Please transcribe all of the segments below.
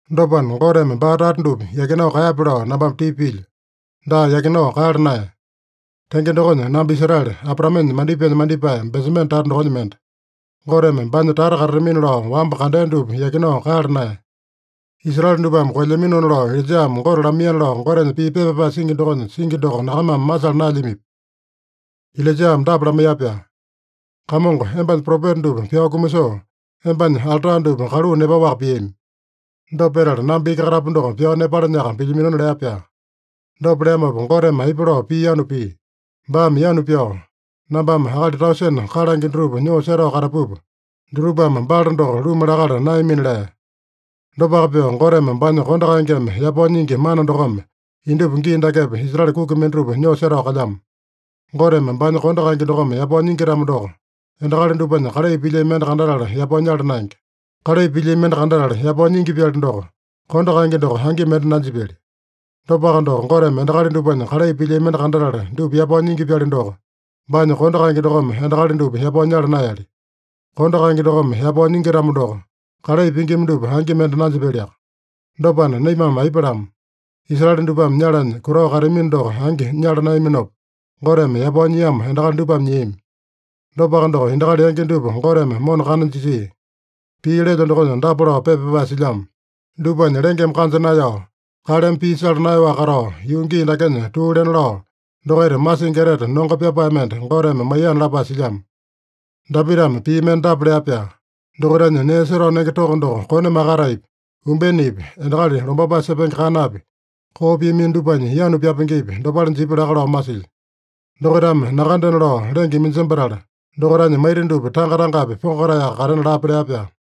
Dopana, Goteme baa tata dupa yakinao kaeyape lao nambame tipa pilyo. Daa, yakinao kaeyala naeya! Tenge dokonya, namba Israele, Abraamenya mandipaenya mandipae, Benjamene tata dokonya mende. Goteme baanya tata katatamina lao wamba kandea dupa yakinao kaeyala naeya. Israele dupame koelyaminona lao Ilaijame Gote lamaiyana lao Gotenya pii pepa pyapae singi dokonya singi doko nyakamame masala naelyamipi? Ilaijame dapa lamaiya-pyaa: “Kamongo embanya propeta dupa pyao kumasoo, embanya alta dupa kaluu nepaowaka piami. Dopa petala namba iki katapu doko pyao nepalanyaka pilyaminona” lea-pyaa. Dopa leamopa, Goteme aipa lao pii yanu pia? Baame yanu pyao, “Nambame akali tausene kalange dutupa nyoo setao katapupa, dutupame Baala doko luma lakala naeyamina” lea. Dopaka pyoo, Goteme baanya kondo kaengeme yapao nyingi mana dokome indupa gii dakepa Israele kuki mendatupa nyoo setao kalyamo. Goteme baanya kondo kaenge dokome yapao nyingi-tamo doko, endakali dupanya kalai pilyami mende kandatala yapao nyala naenge. Kalai pilyami mende kandatala yapao nyingi-pyali doko, kondo kaenge doko angi mende nanjipyali. Dopaka doko, Goteme endakali dupanya kalai pilyami mende kandatala dupa yapao nyingi-pyali doko, baanya kondo kaenge dokome endakali dupa yapao nyala naeyali. Kondo kaenge dokome yapao nyingi-tamo doko, kalai pingima dupa angi mende nanjipyaliaka. Dopana, naimame aipa lama? Israele dupame nyalanya kutao kateamino doko angi nyala naeyaminopa, Goteme yapao nyiamo endakali dupame nyiami. Dopaka doko, endakali yangi dupa Goteme mona kana jisia. Pii lelyo dokonya dapa lao pepa pyapae silyamo: “Dupanya lengeme kanja naeyao, kaleme pii sala naeyaowaka katao, yuu gii dakenya tuu lena lao, dokaita masingi etete nongo pyapae mende Goteme maiyana” lapae silyamo. Dapitame pii mende dapa lea-pyaa: “Dokaitanya nee setao nenge toko doko kone makataepi, umbenepi, endakali lombapae sepenge kanapi, koo piamino dupanya yanu pyapengepi, dopale jipya laka lao masilyo. Dokaitame nakandena lao lenge iminjembatala, dokaitanya maita dupa tanga-tangapi pongotaeyaka katena lape” lea-pyaa.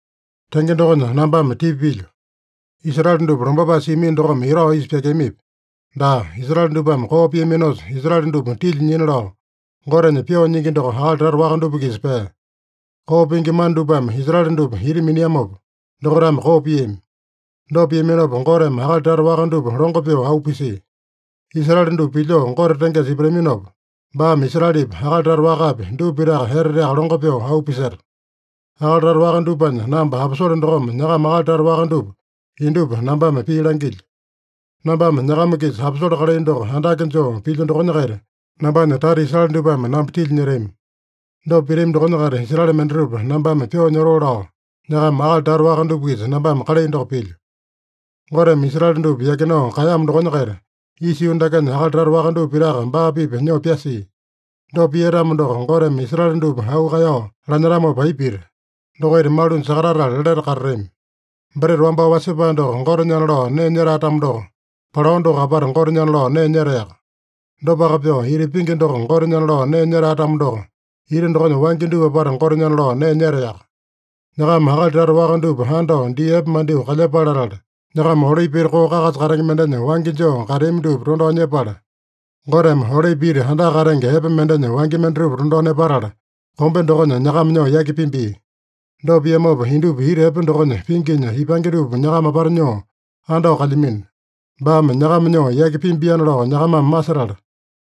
Tenge dokonya nambame tipa pilyo: Israele dupa lombapae siamino dokome etao isa pyakeamipi? Daa! Israele dupame koo piaminosa, Israele dupa tilya nyina lao Gotenya pyoo nyingi doko akali tata waka dupa-kisa pea. Koo pingi mana dupame Israele dupa ita miniamopa dokaitame koo piami. Dopa piaminopa, Goteme akali tata waka dupa longo pyoo auu pisia. Israele dupa pilyoo Gote tengesa ipataminopa, baame Israelepi, akali tata wakapi, dupa pitaka eteteaka longo pyoo auu piseta. Akali tata waka dupanya namba aposole dokome nyakama akali tata waka dupa indupa nambame pii langilyo. Nambame nyakama-kisa aposole kalai doko andake joo pilyo dokonya-kaita, nambanya tata Israele dupame namba tilya nyetami. Dopa pitami dokonya-kaita Israele mendatupa nambame pyoo nyotoo lao nyakama akali tata waka dupa-kisa nambame kalai doko pilyo. Goteme Israele dupa yakinao kaeyamo dokonya-kaita, isa yuu dakenya akali tata dupa pitaka baa-pipa nyoo pyasia. Dopa pia-tamo doko, Goteme Israele dupa auu kaeyao lanyetamopa aipa pita? Dokaita malunya sakatatala lete katatami. Breta wambao wasepae doko Gotenyana lao nee nyetae-tamo doko, palao doko apata Gotenyana lao nee nyetaeyaka. Dopaka pyoo, ita pingi doko Gotenyana lao nee nyetae-tamo doko, ita dokonya wangya dupa apata Gotenyana lao nee nyetaeyaka. Nyakama akali tata waka dupa andao dii epe mandyoo kalyepale latala, nyakama olipi ita koo kakasa katenge mendenya wangya joo kateami dupa tondao nyepala, Goteme olipi ita andaka katenge epe mendenya wangya mendatupa tondao nepatala, kombe dokonya nyakama nyoo yaki pimbia. Dopa piamopa, indupa ita epe dokonya pinginya ipange dupa nyakama apata nyoo andao kalyamino. Baame nyakama nyoo yaki pimbiana lao nyakamame masetala,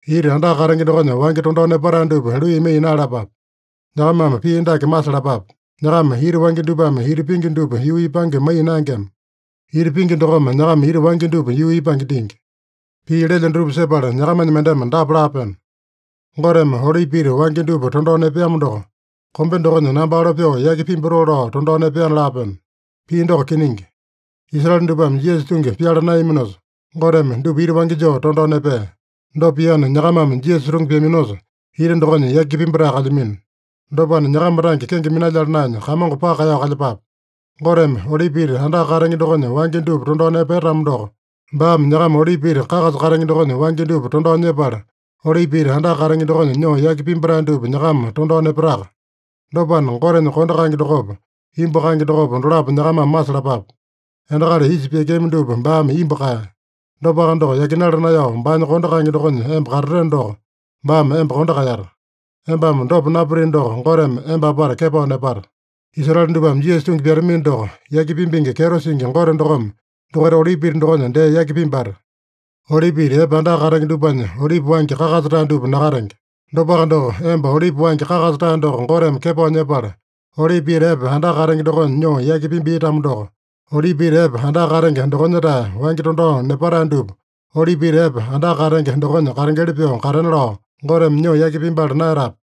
ita andaka katenge dokonya wangya tondao nepatae dupa luiyamaiya naeyalapape. Nyakamame pii dake masalapape: Nyakama ita wangya dupame ita pingi dupa yuu ipange maiya naengema. Ita pingi dokome nyakama ita wangya dupa yuu ipange dingi. Pii lelyo dutupa sepala nyakamanya mendeme dapa laapeno: “Goteme olipi ita wangya dupa tondao nepeamo doko, kombe dokonya namba alo pyoo yaki pimbatoo lao tondao nepeana” laapeno. Pii doko kiningi. Israele dupame Jisasa tungi pyala naeyaminosa, Goteme dupa ita wangya joo tondao nepea. Dopa piana, nyakamame Jisasa tungi pyaminosa, ita dokonya yaki pimbatae kalyamino. Dopana, nyakama tange kenge minalyala naenya, Kamongo paka kaeyao kalyepape. Goteme olipi ita andaka katenge dokonya wangya dupa tondao nepea-tamo doko, baame nyakama olipi ita kakasa katenge dokonya wangya dupa tondao nyepala, olipi ita andaka katenge dokonya nyoo yaki pimbatae dupa nyakama tondao nepataka. Dopana, Gotenya kondo kaenge dokopa, imbu kaenge dokopa, dolapo nyakamame masalapape. Endakali isa pyakeami dupa baame imbu kaeya. Dopaka doko, yakinala naeyao, baanya kondo kaenge dokonya emba katateno doko, baame emba kondo kaeyata. Embame dopa napitino doko, Goteme emba apata kepao nepata. Israele dupame Jisasa tungi pyatamino doko, yaki pimbingi kyeto singi Gote dokome dokaita olipi ita dokonya dee yaki pimbata. Olipi ita epe andaka katenge dupanya olipi wangya kakasa-tae dupa nakatenge. Dopaka doko, emba olipi wangya kakasa-tae doko Goteme kepao nyepala, olipi ita epe andaka katenge dokonya nyoo yaki pimbia-tamo doko, olipi ita epe andaka katenge dokonya-tae wangya tondao nepatae dupa olipi ita epe andaka katenge dokonya katengeli pyoo katena lao, Goteme nyoo yaki pimbala naeyatape?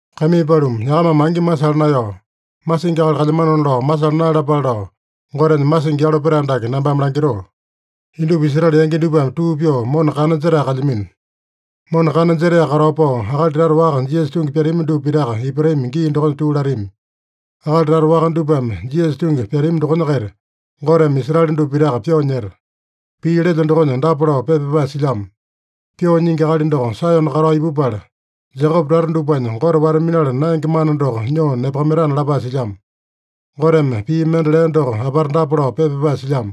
Kaimii paluma, nyakamame angi masala naeyao, masingi akali kalyamanona lao masala naeyalapale lao, Gotenya masingi yalo petae dake nambame langitoo: Indupa Israele yangi dupame tuu pyoo mona kana jetae kalyamino. Mona kana jetaeyaka katao pao, akali tata waka Jisasa tungi pyatami dupa pitaka ipatami gii dokonya tuu latami. Akali tata waka dupame Jisasa tungi pyatami dokonya-kaita, Goteme Israele dupa pitaka pyoo nyeta. Pii lelyo dokonya dapa lao pepa pyapae silyamo: “Pyoo Nyingi Akali doko Saeyone katao ipupala, Jekope tata dupanya Gote wata-minala naenge mana doko nyoo nepakamaitana” lapae silyamo. Goteme pii mende lea doko apata dapa lao pepa pyapae silyamo: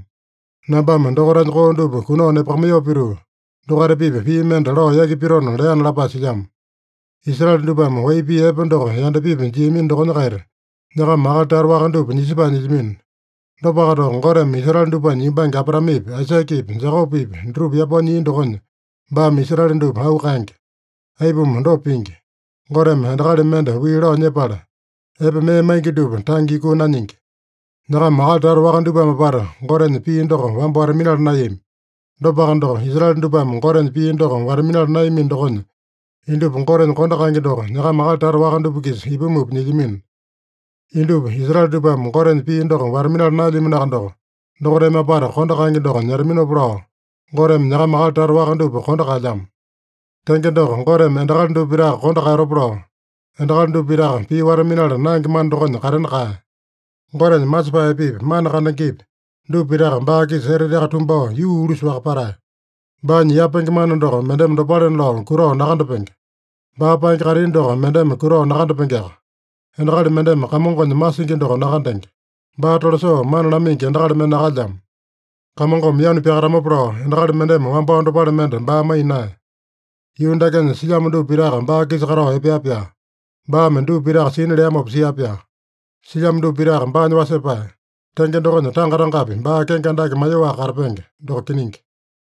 “Nambame dokaitanya koo dupa kunao nepakamaiyoo pituu, dokaita-pipa pii mende lao yaki pitona” leana lapae silyamo. Israele dupame wai pii epe doko yandapipi jiamino dokonya-kaita, nyakama akali tata waka dupa nisepae nyilyamino. Dopaka doko, Goteme Israele dupanya yumbange Abraamepi, Aisakepi, Jekopepi dutupa yapao nyia dokonya, baame Israele dupa auu kaenge. Aipuma dopa pingi? Goteme endakali mende wii lao nyepala, epe mee maingi dupa tange yukuu nanyingi. Nyakama akali tata waka dupame apata Gotenya pii doko wamba wata-minala naeyami. Dopaka doko, Israele dupame Gotenya pii doko wata-minala naeyamino dokonya, indupa Gotenya kondo kaenge doko nyakama akali tata waka dupa-kisa ipumupa nyilyamino. Indupa Israele dupame Gotenya pii doko wata-minala naelyaminoaka doko, dokaitame apata kondo kaenge doko nyetaminopa lao, Goteme nyakama akali tata waka dupa kondo kaelyamo. Tenge doko, Goteme endakali dupa pitaka kondo kaeyatopa lao, endakali dupa pitaka pii wata-minala naenge mana dokonya katena kaeya. Gotenya masepae epepi, mana kandengepi, dupa pitaka baa-kisa eteteaka tumbao yuu ulusale-waka patae! Baanya yapenge mana doko mendeme dopalena lao kutao nakandapenge! Baa paenge kaitini doko mendeme kutao nakandapengeaka! “Endakali mendeme Kamongonya masingi doko nakandenge. Baa tolasoo mana lamaingi endakali mende nakalyamo.” “Kamongome yanu pyakatamopa lao endakali mendeme wambao dopale mende baa maiya naeya.” Yuu dakenya silyamo dupa pitaka baa-kisa katao epea-pyaa. Baame dupa pitaka sina leamopa sia-pyaa. Silyamo dupa pitaka baanya wasepae. Tenge dokonya, tanga-tangapi baa kenge andake maiyoaka katapenge. Doko kiningi.